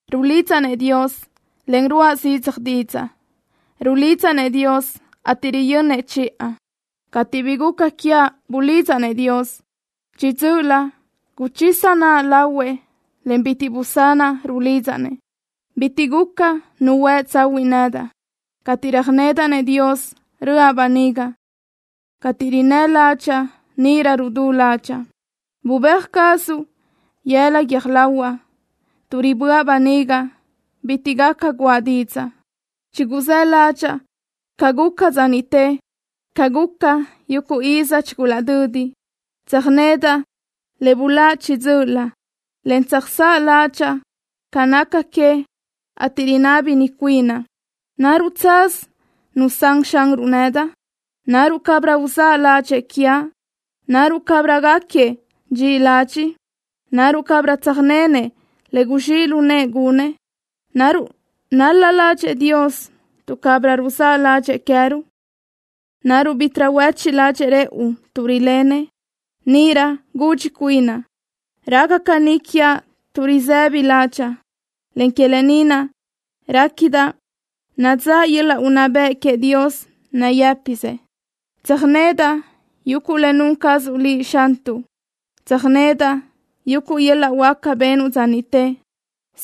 Rulidzaʼ-nëʼ Dios, en ruáʼa zidzaj didzaʼ. Rulidzaʼ-nëʼ Dios, ateʼ riyönnëʼ chiʼa. Cateʼ bi guca quiaʼ bulidzaʼ-nëʼ Dios. Chiʼi dzö́ʼölö guchisa naʼa lahuëʼ, en bitiʼ busanaʼ rulidzaʼ-nëʼ. Bitiʼ guca nu huë tsahuiʼ nedaʼ. Cateʼ röjnedaʼ-nëʼ Dios, röʼa böniga. Cateʼ rinnë́ ládxaʼa, níʼirö rudú ládxaʼa. Bubéaj cazuʼ yëla guiö́j lahuaʼ. Tuʼ riböʼa böniga bitiʼ gaca guʼa didzaʼ. Chiguzáʼ ládxaʼa ca guca dza niʼte, ca guca yuguʼ iz chigulaʼdödi. Tsöjnedaʼ le buláʼ chiʼi dzö́ʼölö, en tsöjsáʼ ládxaʼa ca naca que, ateʼ rinábini cuinaʼ: ¿Naruʼ tsaz nusán Xanruʼ nedaʼ? ¿Naruʼ cabirö uzáʼ ládxëʼë quiaʼ? ¿Naruʼ cabirö gáquiëʼ dxiʼi ladxiʼ? ¿Naruʼ cabirö tsöjnenëʼ le guzxíʼ lu nëʼë gunëʼ? ¿Naruʼ nál-la ládxëʼë Dios tuʼ cabirö ruzáʼ ládxëʼë queë́ruʼ? ¿Naruʼ bítiʼrö huéchiʼ ládxëʼë rëʼu tuʼ rilenëʼ? Níʼirö gudxi cuinaʼ: Raca caní quiaʼ tuʼ risë́bidaʼ ládxaʼa, en que lë ni naʼ réquidaʼ nadzáʼ yöl-laʼ unná bëʼ queëʼ Dios nayë́pisëʼ. Tsöjnedaʼ yuguʼ le nun cazuʼ Liʼ, Xantuʼ. Tsöjnedaʼ yuguʼ yöl-laʼ huáca benuʼ dza niʼte.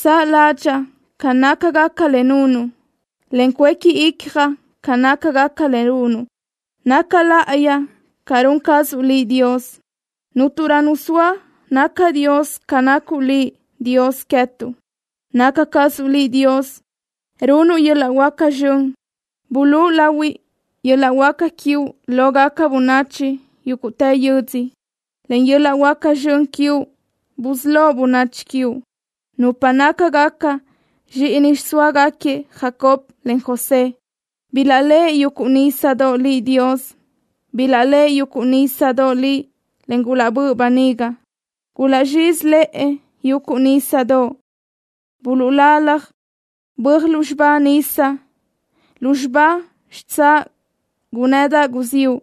Saʼ ládxaʼa ca nácagaca le nunuʼ, en cuéqui icjaʼ ca nácagaca le runuʼ. Naca láʼayi ca run cazuʼ Liʼ, Dios. Cúnturö nu zoa naca dios ca nacuʼ Liʼ, Dios queë́tuʼ. Naca cazuʼ Liʼ Dios, runuʼ yuguʼ yöl-laʼ huáca zxön. Bulúʼu lahui yöl-laʼ huáca quiuʼ lógaca bönachi yúguʼtë yödzö. Len yöl-laʼ huáca zxön quiuʼ busölóʼ bönachi quiuʼ, nupa nácagaca zxíʼini xiʼsóagaquiëʼ Jacob, en José. Bilaʼléʼe yuguʼ nísadoʼ Liʼ, Dios. Bilaʼléʼe yuguʼ nísadoʼ Liʼ, en gulaʼbö́ʼ böniga. Gulaʼzxízilëʼe yuguʼ nísadoʼ. Buluʼlalaj böaj lúzxiba nisa. Lúzxiba xitsáʼ gunnëdaʼ guziúʼ.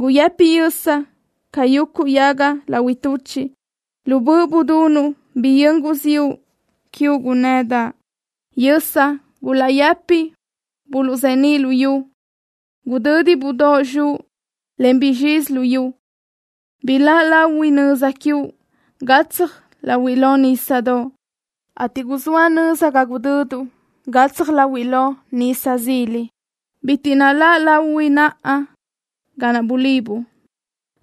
Guyëpi yösa ca yuguʼ yaga lahui tuchiʼ. Lu böʼ budunuʼ biyö́n guziúʼ quiuʼ gunnëdaʼ. Yösa gulaʼyëpi buluʼzeníʼ luyú. Gudö́didaʼ budóʼ zxuʼ, en guzxizi luyú. Biláʼ lahui nöza quiuʼ gatsaj láhuiʼlö nísadoʼ, ateʼ guzóa nöza ga gudöduʼ gatsaj láhuiʼlö nisa zila. Bitiʼ naláʼ lahui naʼa ga naʼ bulibuʼ.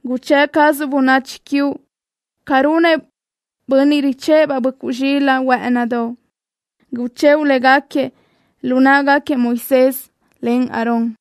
Guchë́ʼ cazuʼ bönachi quiuʼ ca runëʼ bönniʼ richë́ʼë-baʼ böʼcuʼ zxilaʼ huë́ʼënidoʼ. Guchëʼu léguequi lu náʼagaquiëʼ Moisés, en Aarón.